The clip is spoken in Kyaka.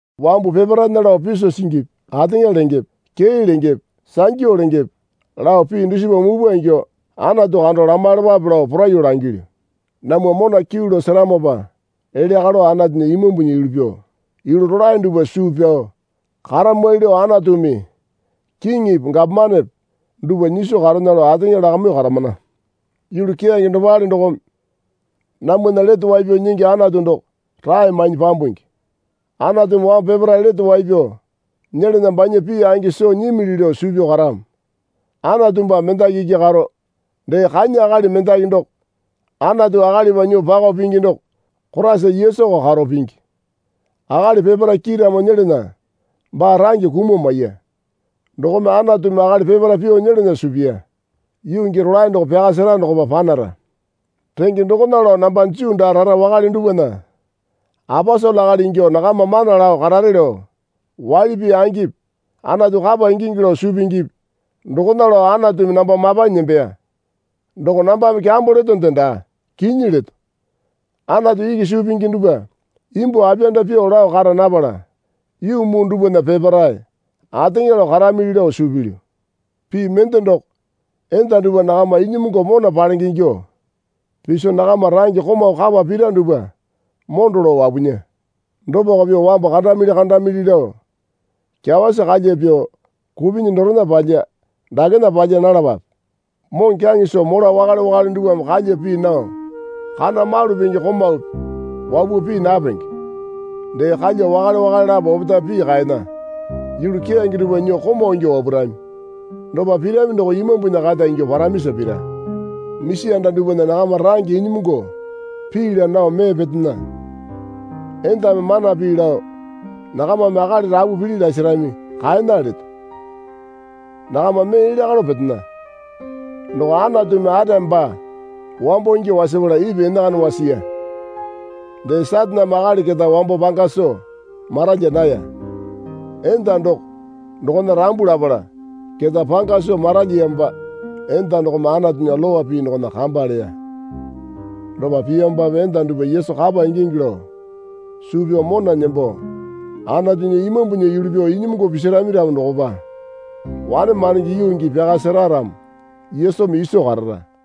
Wambu peparaena lao piso singipi ateŋa lengepe kee lengepe sangyu lengepe lao pii dusipa mupwa ingyuo Anatu kando lamaiyalapape lao poraiyuo langilyu. Namwa mona kyuu lao seramopa elya kalo Anatunya Imambunya yulu pyuo yulu rolae dupwa suu pyao karamwali lao Anatumi kiŋipi gapomanepe dupwa nyiso karena lao ateŋa lakamyuo karamana. Yulu keyange dopale dokome namwana Lete Wai Pyao Nyingi Anatu doko rae mainyi pyambungi. Anatumi wambu peparae lete wai pyao nyelana banya pii angi soo nyimili lao suu pyao karamo. Anatu baa mendaki iki karo, dee kanya akali mendaki doko Anatu akalipa nyuo pakao pingi doko Koraisa Yesuko karo pingi. Akali peparae kiiramo nyelana baa range kumuo maiya. Dokome Anatumi akali peparae pyuo nyelana suu piya, yuu gii rolae doko pyaka sera dokopa panara. Renge dokona lao namba Juu daa rara wakale dupwana aposele akali ingyuo nakama mana lao karare lao waili pii angipi Anatu kapa ingingi lao suu pingipi dokona lao Anatumi namba mapanyi nembeya. Doko nambame kyambo letonde daa. Kinyi leto. Anatu iki suu pingi dupwa imbuo apiyanda pyuo lao kara napala yuu muu dupwana peparae ateŋa lao karamili lao suu pilyu. Pii mende doko enda dupwa nakama inyimungu mona palenge ingyuo piso nakama range komau kapa pira dupwa mondo lao wapunya. Dopako pyuo wambu kandamili kandamili lao kyawasi kalya pyuo kupinyi dorena palya dakena palya nalapape. Moŋokyaŋe soo mola wakale wakale dupwame kalya pii nao kana malu penge komaupi wapuo pii napenge. Dee kalya wakale wakale lapo opetae pii kaena. Yulu keyange dupwa nyuo komau ingyuo wapurami. Dopa pirami doko Imambunya kata ingyuo paramisa pira. Misi anda dupwana nakama range inyimungu pii laa nao mee petena. Endame mana pii lao nakamame akali rapu pili lasarami kaena leto. Nakama mee elya kalo petena. Doko Anatumi Atame baa wambo ingyuo wasapala Ipi enakana wasiya. Dee Sataneme akali keta wambo panga soo maralya naya. Enda doko dokona rambu lapala keta panga soo maralyamopa enda dokome Anatunya lowa pii dokona kamba leya. Dopa piyamopape enda dupwa Yesu kapa ingingi lao suu pyao mona nembo Anatunya Imambunya yulu pyuo inyimungu pisarami ramo dokopa wane mandenge yuu gii pyaka sera ramo Yesumi iso karara.